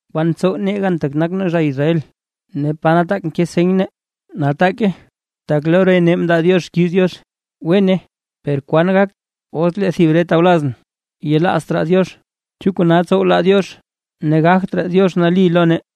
¿Kwan ntsow nee gan tak nak nee zha Israel? Ne ¿pa nataak nke seny nee? Nataake tak lo re nee mndaa Diox xkiiz Diox. Wene, ¿per kwan gak os lee thib re tawlaz nee yelaazt raa Diox? ¿Chu kona tsow laa Diox ne gagt raa Diox nali lo nee?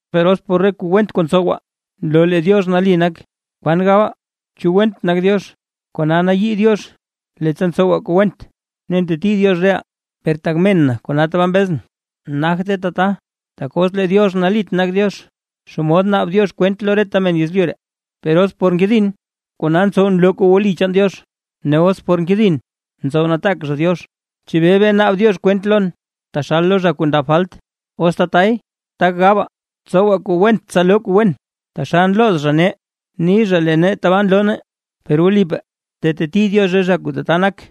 Per os por re kuu went kuu ntsowaa, nloo lee Diox nali nak, ¿kwan gabaa? ¿Chu went nak Diox kona nayii Diox leettsa ntsowaa kuu went, ne nteti Diox reʼaa? (Per tak men na kona tabaa mbezʼn.) ¡Nagte tata! Tak os lee Diox nalit nak Diox, ¿Xomod naab Diox kwent lo reta men yezlyu ree? Per os por nkedin, kona ntsow nloo kuu wli chaan Diox, ne os por nkedin ntsow nataak zha Diox ¿Chebee bee naab Diox kwent lon taxal lo zha kuu ndab falt? Os tatay, tak gabaa. “Tsowaa kuu went tsa loo kuu wen”, taxal nlooz zha nee ni zha lee nee tabaa nloo nee, per wlipaa teteti Diox re zha kuu tata nak.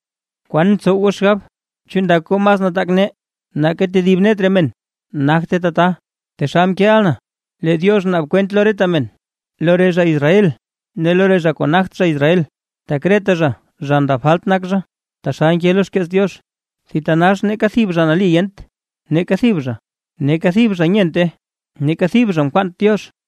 ¿Kwan ntsow goo xgab? ¿Chu ndak goo mas nataak nee nake tedib net re men? ¡Nagte tata! Taxal mkeeʼa na, lee Diox naab kwent lo reta men, lo re zha Israel ne lo re zha kuu nagt zha Israel, tak reta zha zha ndab falt nak zha. Taxal nke lo xkeets Diox: ¡Thitanax neeka thib zha nali yent! ¡Neeka thib zha! Neeka thib zha nyente, neeka thib zha nkwaant Diox.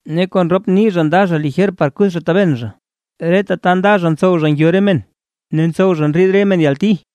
Ne kon rop nii zha nda zha lijer par kuth zha taben zha. Reta ta nda zha ntsow zha ngyo re men ne ntsow zha ndriid re men yalti.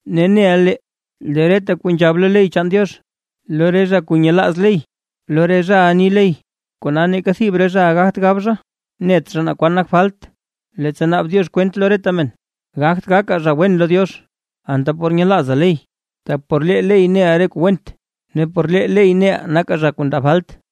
Ne neʼa lee, lee reta kuu nzhab lo ley chaan Diox, lo re zha kuu nyelaaz ley lo re zhaʼa ni ley. Kona neeka thib re zhaʼa gagt gab zha, net zha naa kwan nak falt, leettsa naab Diox kwent lo reta men. Gagt gakaa zha wen lo Diox, anta por nyelaazaa ley. Tak por lee ley neʼaa re kuu went ne por lee ley neʼaa nakaa zha kuu ndab falt.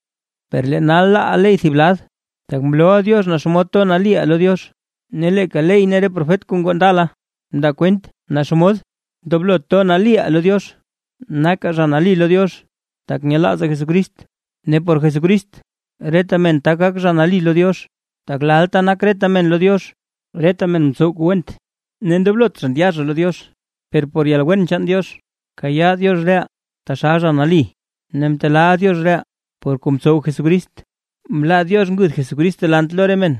Per lee nal laaʼaa ley thib lad, tak mlooʼa Diox naa xomod nali toʼaa lo Diox, ne leeka ley ne re profet kuu ngoo ndala mndaa kwent naa xomod ndoblo nali toʼaa lo Diox. Nakaa zha nali lo Diox, tak nyelaazaa Jesucrist ne por Jesucrist reta men tak gak zha nali lo Diox, tak lalta nak reta men lo Diox. Reta men mtsow kuu went, ne ndoblot zha ndya zha lo Diox. Per por yalwen chaan Diox kayaa Diox reʼaa, taxal zha nali ne mtelaa Diox reʼaa, por kuu mtsow Jesucrist. Mlaa Diox nguth Jesucrist delant lo re men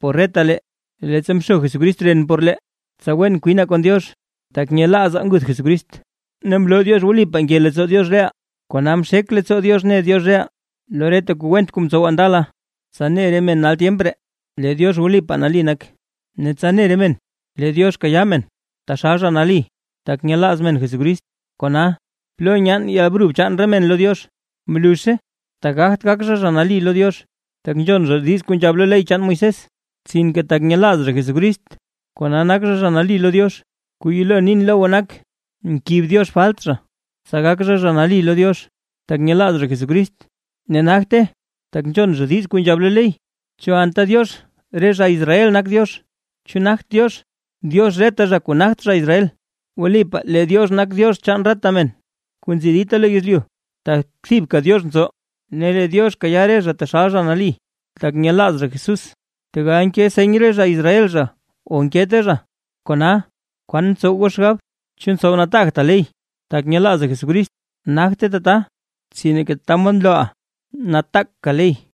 por retalee, leettsa mxo Jesucrist ren por lee, tsa wen kwinaa kon Diox tak nyelaazaa nguth Jesucrist; ne mloo Diox wlipaa nke leettsoo Diox reʼaa, kona mxek leettsoo Diox mne Diox reʼaa lo reta kuu went kuu mtsowaa ndala, tsa ne re men nal tyemp ree lee Diox wlipaa nali nak, ne tsa ne re men lee Diox kayaa men, taxal zha nali tak nyelaaz men Jesucrist. Kona, ¿plo nyaan yalbrub chaan re men lo Diox? ¡Mluzhe! Tak gagt gak zha zha nali lo Diox, tak nzhon zha kuu nzhab lo ley chaan Moisés; sinke tak nyelaaz zha Jesucrist, kona nak zha zha nali lo Diox. Kuu yelo nin lo goo nak, nkib Diox falt zha, tsa gak zha zha nali lo Diox, tak nyelaaz zha Jesucrist, ne nagte, tak nzhon zha diiz kuu nzhab lo ley. ¿Chu anta Diox re zha Israel nak Diox? ¿Chu nagt Diox, Diox reta zha kuu nagt zha Israel? Wlipaa lee Diox nak Diox chaan reta men kuu nzi dita lo yezlyu, tak thibka Diox nzo; ne lee Diox kayaa re zha taxal zha nali tak nyelaaz zha Jesús, tegal nke seny re zha Israel zha o nkete zha. Kona, ¿kwan ntsow goo xgab? ¿Chu ntsow nataagtaa ley tak nyelaazaa Jesucrist? ¡Nagte tata! Sinke tata mod nlooʼaa nataaka ley.